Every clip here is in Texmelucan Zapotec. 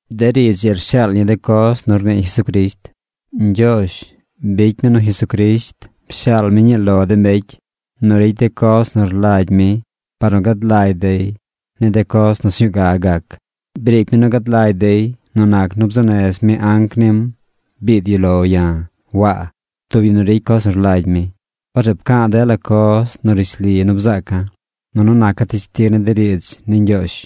De riidz ii rshaal ñi de coz nu rnii Jesucrisht. Ñgyoozh bicy mi nu Jesucrisht pshaal mi ñii lo de mbecy nu ricy de coz nu rlagy mi par nu gad lagy dey ni de coz nu sñuu ga gac. Briic mi nu gad lagy dey nu nac nu bzuu nez mi anc nim biid yu lo ya̱, Waa, tub yu nu ricy coz nu rlagy mi. Orzeꞌ pca̱a̱ dela coz nu rishli nu bzaaca̱, nunu naca̱ teshtig ni de riidz ni Ñgyoozh.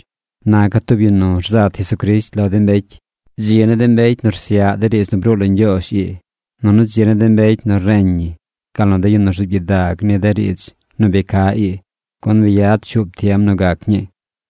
Naca̱ tub yu nu rzat Jesucrisht lo de mbecy. Dzi ni de mbecy nu rsyaꞌ de riidz nu bruu lo Ñgyoozh ii. Nunu dzi ni de mbecy nu reñ ñi gal nu de yu nu rzuub gyidag ni de riidz nu bi ca ii, gun bi yad shuub tiem nu gac ñii.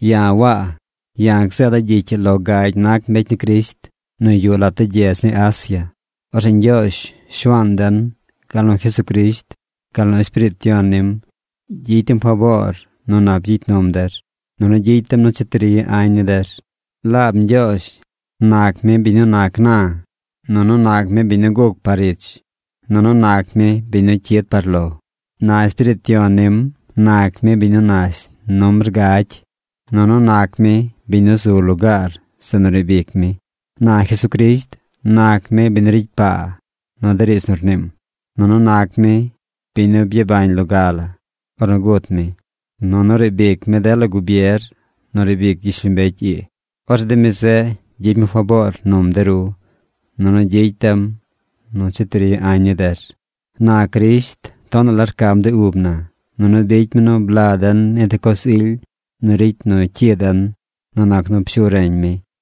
Ya̱ Waa. Ya̱ gzeeda̱ gyicy ii lo gagy nac mbecy ni Crisht nu yuꞌ lat de gyedz ni Asia. Orzeꞌ Ñgyoozh, Shuaan den, gal nu Jesucrisht, gal nu Espiriit Yon nim gyicy dem faboor nu nap gyicy num der, nunu gyicy dem nu cheti ri añ ni der. Laab Ñgyoozh nac mi biñ nu nac na, nunu nac mi biñ nu guc par ich, nunu nac mi biñ nu cyid par lo. Na Espiriit Yon nim nac mi biñ nu nash numbr gagy, nunu nac mi biñ nu zu lugaar zeꞌ nu riib ic mi. Na Jesucrisht nac mi biñ nu ricy paa nu de riidz nu rniim. Nunu nac mi biñ nu byabañ nu loga la ornu gut mi. Nunu riib ic mi dela gubier nu riib ic gyishlombecy ii. Orzeꞌ de mi zeꞌ gyicy mi faboor num de ru, nunu gyicy dem nu cheti ri añ ni der. Na Crisht tonaꞌ la rcam de ub na, nunu bicy mi nu bla den ni de coz ily nu ricy nu cyi den nu nac nu pshu reñ mi.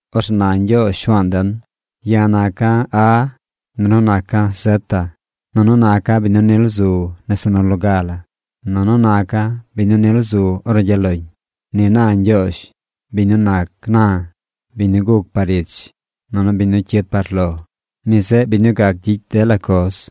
Orzeꞌ na Ñgyoozh Shuaan den: “Ya̱ naca̱ A, nunu naca̱ zeta. Nunu naca̱ biñ nu nil zu nese nu loga. Nunu naca̱ biñ nu nil zu ornu gyaꞌ loñ.” Ni na Ñgyoozh, biñ nu nac na, biñ nu guc par ich, nunu biñ nu cyid par lo. Mi zeꞌ biñ nu gac gyicy dela coz.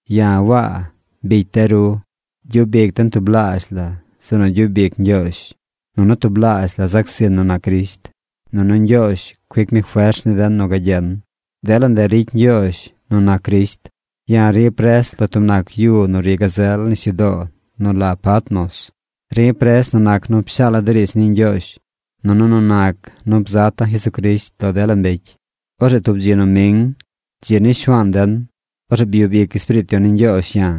Ya̱ Waa bicy de ru. Gyub ic den tublaazh la zeꞌ nu gyub ic Ñgyoozh. Nunu tublaazh la zac zin nu nac Crisht. Nunu Ñgyoozh cuic mi fers ni den nu gagyen. Dela ndeꞌ ricy Ñgyoozh nu nac Crisht. Ya̱ ri̱ pres lo tub nac yu nu ri gazel nisyudoo nu la Patmos. Ri̱ pres nu nac nu pshaala̱ de riidz ni Ñgyoozh, nunu nu nac nu bzata̱ Jesucrisht lo dela mbecy. Orzeꞌ tub dzi noming, dzi ni Shuaan den, orzeꞌ byub ic Espiriit Yon ni Ñgyoozh ya̱.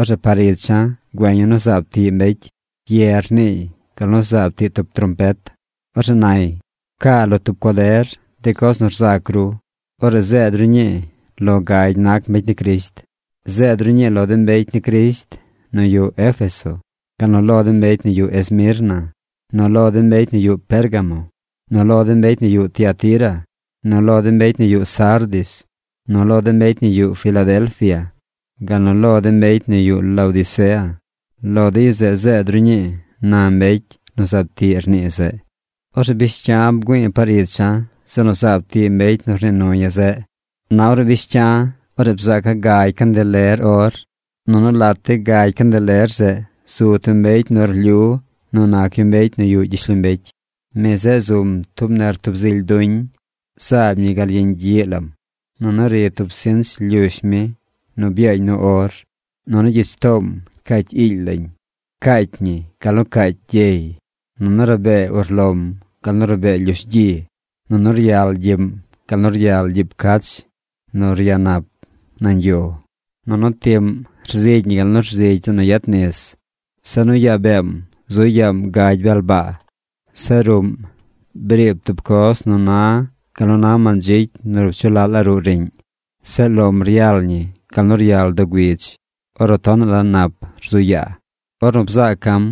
Orzeꞌ par icha̱ güeña̱ nu zaab tiꞌ mbecy. Ye rniiy gal nu zaab tiꞌ tub trompet. Orzeꞌ nay: ―Pcaa lo tub cuader de coz nu rzac ru. Orzeꞌ zeed ru ñii lo gagy nac mbecy ni Crisht. Zeed ru ñii lo de mbecy ni Crisht nu yuꞌ Éfeso, gal nu lo de mbecy nu yuꞌ Esmirna, nu lo de mbecy nu yuꞌ Pérgamo, nu lo de mbecy nu yuꞌ Tiatira, nu lo de mbecy nu yuꞌ Sardis, nu lo de mbecy nu yuꞌ Filadelfia, gal nu lo de mbecy nu yuꞌ Laodicea. Lo de yu zeꞌ zeed ru ñii ―na mbecy nu zaab tiꞌ rnii zeꞌ. Orzeꞌ bish cya̱ bgüi̱i̱ par icha̱ zeꞌ nu zaab tiꞌ mbecy nu rnii nu ya̱ zeꞌ. Na ornu bish cya̱, orzeꞌ bzaaca̱ gagy candeler or. Nunu lat de gagy candeler zeꞌ zu tub mbecy nu rlyu nu nac yu mbecy nu yuꞌ gyishlombecy. Mi zeꞌ zum tub nertub zily duñ. Zaab ñi gal yeñ gyiꞌ lam. Nunu ri tub sinch lyush mi nu byaañ nu or. Nunu gyich toom cacy iily lañ. Caacy ñi gal nu caacy gyey. Nunu rabee urlom gal nu rabee lyush gyi. Nunu ryal gyiꞌm gal nu ryal gyiib cach nu ryanap nañ yo. Nunu tiꞌm rzigy ñi gal nu rzigy zeꞌ nu yet nis. Zeꞌ nu yaa beem zu yaam gagy bel baa. Zeꞌ ruꞌm briib tub coz nu na gal nu na mandzicy nu rup dzu laꞌ la ruꞌ riꞌñ. Zeꞌ lom ryal ñi gal nu ryal doo güidz ornu tonaꞌ la nap rzu yaa. Ornu bzaaca̱m,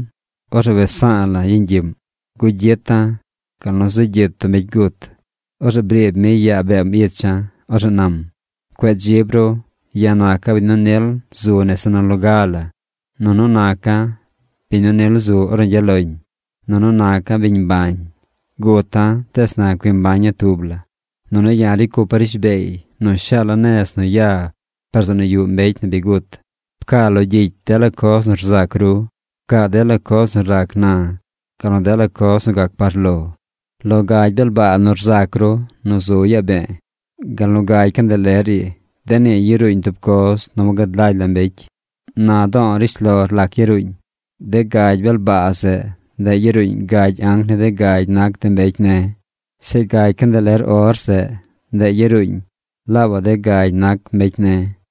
orzeꞌ wes sa̱a̱ la̱ yeñ gyiꞌm. Gugyita̱ gal nu zegyit tub mbecy gut. Orzeꞌ briib mi yaa beem icha̱. Orzeꞌ nam: ―Cueꞌ dzib ru. Ya̱ naca̱ biñ nu nil zu nese nu loga la, nunu naca̱ biñ nu nil zu ornu gyaꞌ loñ. Nunu naca̱ biñ mbañ. Guta̱ tees na cui mbaña̱ tub la. Nunu ya̱ ricy cupa̱ rishbeey nu shaala̱ nez nu ya par zeꞌ nu yuꞌ mbecy nu bi gut. Pcaa lo gyicy dela coz nu rzac ru. Pcaa dela coz nu rac na gal nu dela coz nu gac par lo. Lo gagy bel baa nu rzac ru nu zu yaa be̱e̱, gal nu gagy candeler ii, de nii yaruuñ tub coz nu wagad lagy la mbecy. Na do̱o̱ rishlor lac yaruuñ. De gagy bel baa zeꞌ, ndeꞌ yaruuñ gagy anc ni de gagy nac de mbecy ne̱. Zeꞌ gagy candeler or zeꞌ, ndeꞌ yaruuñ laabaꞌ de gagy nac mbecy ne̱.